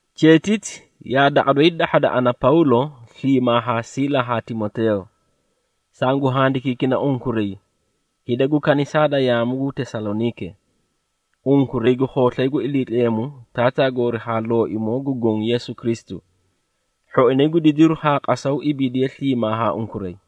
Cheetiti yaa daqa doyi dahhada ana, Pawlo, sliimaa haa Siila haa Timoteeyo. Sangu handikiikina unkuray, hida gu kanisaa da yaamu gu Tesaloniike, unkuray gu khooslay gu Iliitleemu Taataa goori haa Looimoo gu Goõ Yeesu Kristu. Hhoinay gu didiru haa qasaw ibiidiye sliimaa haa unkuray.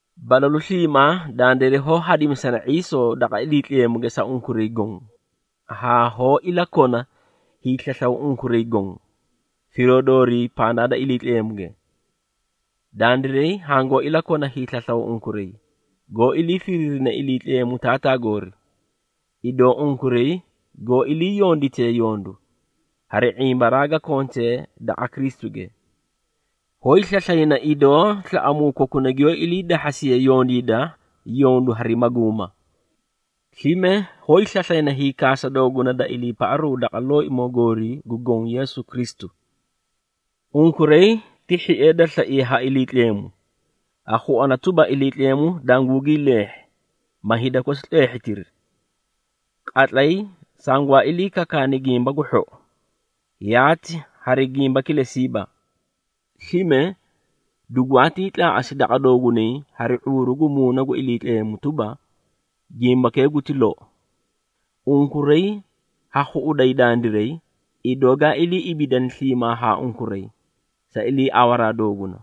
Balalu sliimaa dandiray hoó hadimisana ⁄iisoo daqa Iliitleemuge sa unkuray goõ, haa hoó ilakona hiislaslaw unkuray goõ, firoo doorii pandaa da Iliitleemuge. Dandiray hangoó ilakona hiislaslaw unkuray, goó ilii firiirine Iliitleemu Taataa goori, idoo unkuray goó iliiyonditee yondu, hari ⁄imbaraa ga kontee daqa Kristuge. Hoóyi slaslayna, idoo slaꞌamuu kokuna giyoó iliidahhasiye yondiida yondu hari maguuma. Slime, hoóyi slaslayna hiikaasa dooguna da iliipaꞌaru daqa Looimoo goori gu Goõ Yeesu Kristu. Unkuray ti hhiee da slaiye ha Iliitleemu, ha khuana tuba Iliitleemu dangugii leehhi, ma hida kosi tleehhitiri. Qatlay sangwaa ilii kakaani Gimba gu Hhou, yaati hari gimba kilesiiba. Slime, dugwaatii tlaaꞌasi daqa doogunay hari ⁄uuru gu Muuna gu Iliitleemu tuba, gimbakee guti lou. Unkuray ha khuꞌuday dandiray, idoó gaa ilii ibiidani sliimaa haa unkuray, sa iliiawaraa dooguna.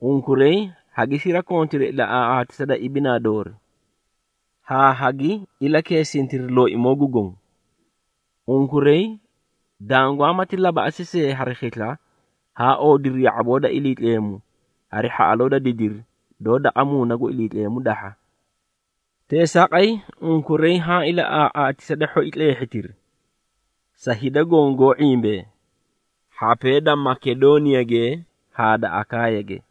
Unkuray hagi sirakontiri ilaꞌaaꞌaatisa da ibinaa doori, haa hagi ilakeesintiri Looimoo gu Goõ. Unkuray dangwaamati labaꞌasi see hari khisla, haa oodiri ya⁄aboo da Iliitleemu, hari hhaꞌaloo da didiri, doó daqa Muuna gu Iliitleemu dahha. Teesaaqay, unkuray haã ilaꞌaaꞌaatisa da hhoi tleehhitiri, sa hida goõ goó ⁄imbee, hhapee da Makedooniyage haa da Akaayage.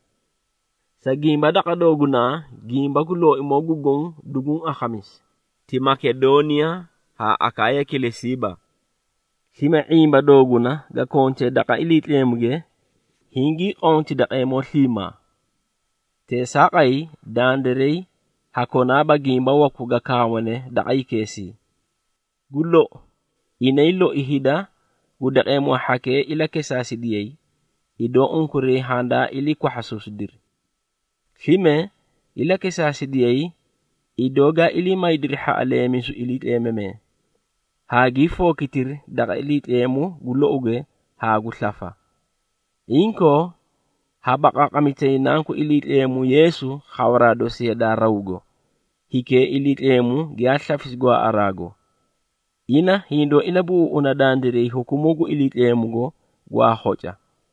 Sa gimba, daqa doogunaa, gimba gu Looimoo gu Goõ duguũ akhamisi, ti Makedooniya haa Akaaya kilesiiba. Slime ⁄imba dooguna ga kontee daqa Iliitleemuge, hingii qoomi daqeemoo sliimaa. Teesaaqay, dandiray ha konaaba gimba waku ga kaawane daqa hikeesii. Gu lou, inay loi hida gu daqeemoo hhakee ilakesaasidiyay, idoo unkuray handaa ilii kwahhasuusidiri. Slime, ilakesaasidiyay idoo gaa ilii maydiri hhaꞌaleemisu iliitleemamee, haagii fookitiri daqa Iliitleemu gu louge haa gu slafa. Inkoo, ha baqaaqamitayi Nanku Iliitleemu Yeesu khawaraa dosi yadaa rawgo, hikee Iliitleemu giyaa slafisi gwaaꞌaraago. Ina hindoó ilabuꞌuuꞌuna dandiray hukumuu gu Iliitleemugo gwaa khoca.